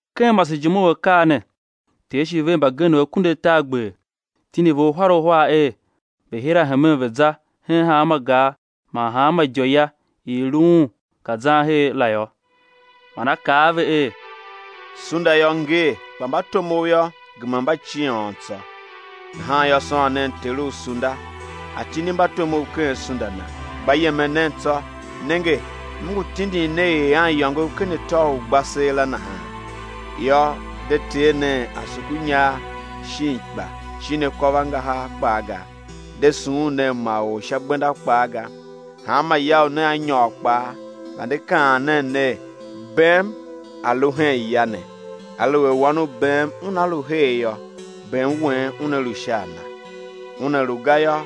Ken masejime u akaa ne Ter shi ver mbagenev akunduatargber, tindi ve uhar uhar er, ve̱ hira hemen ve̱ za hen hanma gar man hanma idiôya i i lu Un ka zan her la yô. Man A kaa a ve er: Sunda yô, ngee, kpa mbatomov yô, gema mba ciôn tsô; nahan yô, sôn nen Ter u sunda A̱ tindi mbatomov ken sunda Na. Gba yemen nen tsô; nenge, M ngu tindin ne er aniyôngov ken atô u ugbaseela nahan yô. De tee nen asukunyar, shin ikpa, shin akôvangahar kpaa ga; de sughun nen ma or sha gbenda kpaa ga. Hanma ya u nea nyôr kpaa, vande kaan nen ner: Bem a̱ lu hen ya ne. Aluer wan u bem una lu her yô, bem wen una lu sha a nan; una lu ga yô,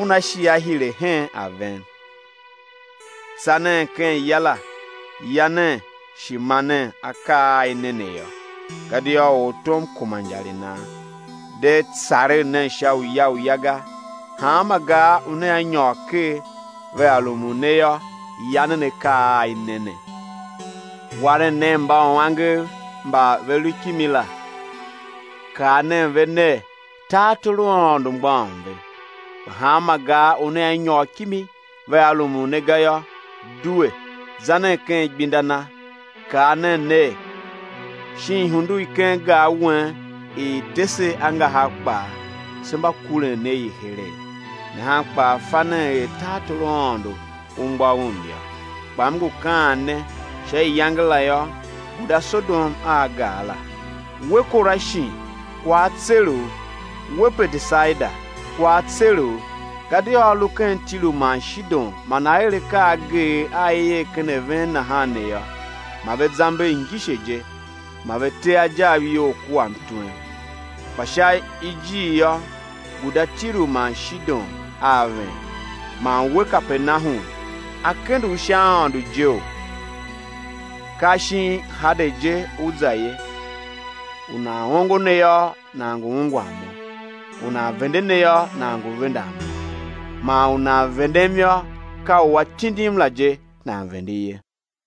una shi á hire hen a ven. Tsa nen ken ya la, ya nen shi ma nen akaa a i ne ne yô, gadia ortom kuma injar i nan. De tsaregh nen sha uya uya ga. Hanma gar u nea nyôr ker, vea rumun ne yô, ya nen akaa a i ne ne. Waren nen mbauangev mba ve lu kimi la, kaa nen ve ner: Tartor u Aôndo mgbôghom a ven. Kpa hanma gar u nea nyôr kimi, vea rumun ne ga yô, due, za nen ken igbenda na, kaa nen ner: Shin ihundu i ken gar wen i i te se angahar kpaa, se mba kuren ne i heregh nahan kpaa fa nen er tartor u Aôndo u mgbôghom yô. Kpa M ngu kaan ne, sha iyange la yô, guda Sodom a gar la. We, Korashin kwagh á tser u, we Betesaida, kwagh á tser u. Gadia a lu ken Tiru man Shidon man a er akaa ageegh a i er ken a ven nahan ne yô, ma ve zamber ngise je, ma ve te ajav iyol kua mtwem. Kpa sha ijir yô, guda Tiru man Shidon a ven. Man we, Kapernahum, á kende u sha aôndo jeo? Ka shin Hade je ú za ye. U nan ongo ne yô, nan ngu ungwan Mo; u nan vende ne yô, nan ngu vendan Mo; man u nan vendem yô, ka u A tindim la je, nan vende ye.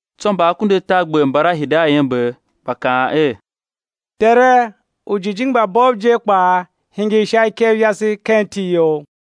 Tsô mba akunduatargber mbala hide a iember, gba kaan er: Tere, ujijingi mba bov je kpaa hingir sha ikev yase ken iti You.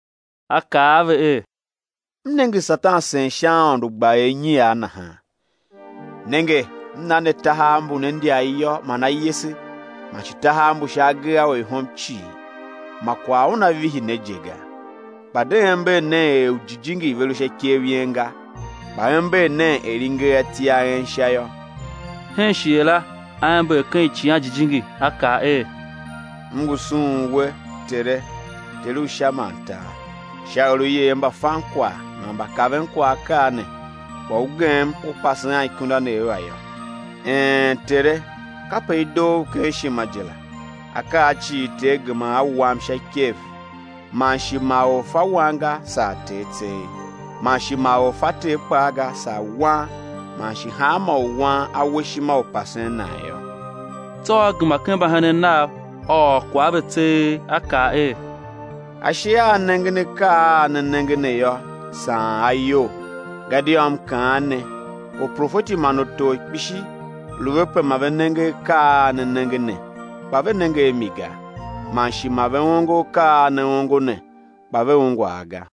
A kaa a ve er: M nenge Satan sen sha aôndo, gba er inyiar nahan. Nenge M na ne tahav mbu ne ndyar iyô man ayese, man shi tahav mbu sha agee a orihom cii, ma kwagh una vihi ne je ga. Kpa de ember nen er ujijingi ve lu sha ikev yen ga, kpa ember nen er i nger ati a en Sha yô. Hen shighe la A ember ken Icighan Jijingi, A kaa er: M ngu sughun We, Tere, Ter u Sha man tar, sha er U yer mbafankwagh man mbakavenkwagh akaa ne, kpa U gem U pase anikundanev a yô; een Tere! kape i doo U ken ishima je la. Akaa cii Ter gema a wam sha ikev; man shi ma or fa Wan ga, saa Ter tseegh; man shi ma or fa Ter kpaa ga, saa Wan, man shi hanmô u Wan A we ishima u pasen nan yô. Tsô A gema ken mbahenen Nav A ôr kwagh a ve tseegh A kaa er: Ashe a a nengen akaa a ne nenge ne yô, saan a iyol. Gadia M kaan ne, uprofeti man utor kpishi lu ve pe ma ve nenge akaa a ne nenge ne, kpa ve nenge a mi ga; man shi ma ve ongo akaa a ne ongo ne, kpa ve ungwa a ga.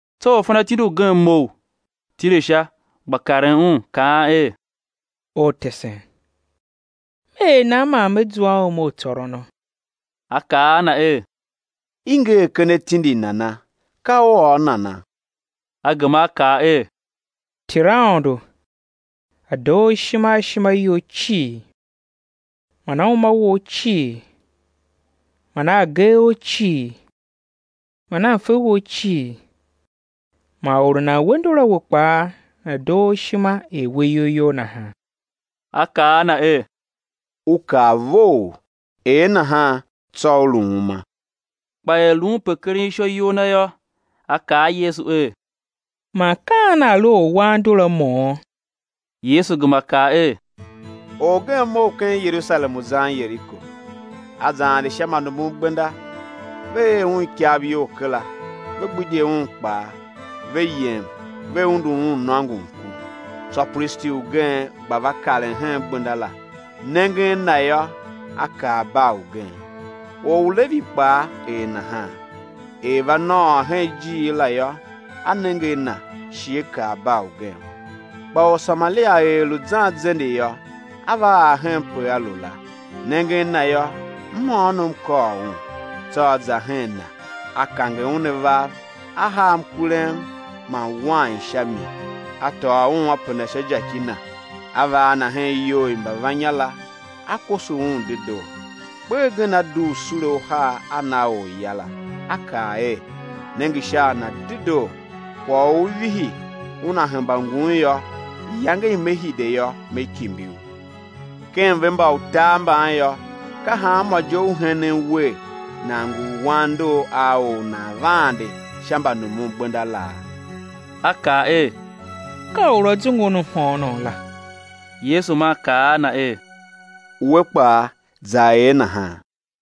Tsô orfanatindi ugen mough, tile sha, gba karen Un, kaan er: Ortesen, me er nan man me zua a uma u tsôrono? A kaa a na er: I nger ken atindi nana? Ka u ôr nana? A gema a kaa er: Ter Aôndo, A̱ doo u ishima a ishima you cii man a uma wou cii man a agee ou cii man a mfe wou cii, man or u nan we ndor a we kpaa, nana̱ doo u ishima er we iyol you nahan. A kaa a na er: U kaa vough; er nahan, tsô ú lu uma. Kpa er lu un pe keren ishô iyol na yô, a kaa a Yesu er: Man ka an nan lu orwan ndor a mo? Yesu gema kaa er: Orgen mough ken Yerusalem u zan Yeriko, a za ande sha mbanumungbenda, ve er un ikav iyol kera, ve gbidye un kpaa, ve yem, ve undu un nôngon ku. Tsô pristi ugen gba va karen hen gbenda la; nengen na yô, a kar bar ugen. Or u Levi kpaa er nahan, er va nôôr hen ijiir la yô, a nenge a na, shi a kar bar ugen. Kpa Orsamaria er lu zan zende yô, a va ar henpe a lu la; nengen na yô, mhôônom kôr un. Tsô a za hen na, a kange un avav, a haa mkurem man wain sha mi, a tôô un a penda sha jaki na, a va a na hen iyou i mbavannya la, a koso un dedoo. Kper gen a dugh sule uhar, a na orya la, a kaa er: Nenge sha a na dedoo; kwagh u ú vihi, una hemba ngun yô, iyange i me hide yô, me kimbi u. Ken ve mba utar mban yô, ka hanmô je u henen wer nan ngu u wan ndor a or u nan va ande sha mbanumungbenda laa? A kaa er: Ka or u a zungu un mhôônom la. Yesu maa kaa a na er: We kpaa, za er nahan.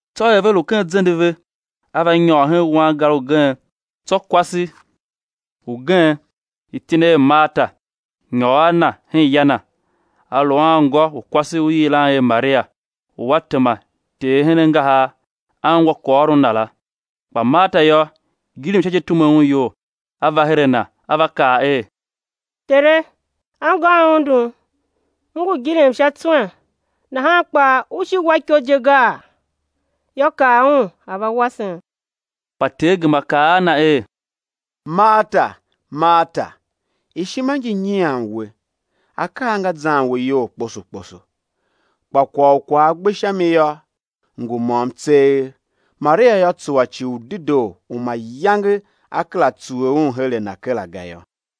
Tsô er ve lu ken zende ve, A va nyôr hen wangar ugen; tsô kwase ugen, iti na er Marta, nyôr a Na hen ya na. A lu a anngô u kwase u i yilan er Maria, u a tema Ter hen angahar, a ungwa kwaghôron Na la. Kpa Marta yô, gilim sha je tume un iyol; a va her a Na, a va kaa er: Tere, anngôm undum, m ngu gilim sha tswen, nahan kpaa U shi U wa iko je gaa? Yô, kaa un a̱ va wasem! Kpa Ter gema kaa a na er: Marta, Marta, ishima ngi nyian we, akaa nga zan we iyol kposo kposo. Kpa kwagh u kwagh a gbe sha mi yô, ngu môm tseegh; Maria yô, tsuwa ci u dedoo u mayange á kera tsuwe un her a na kera ga yô.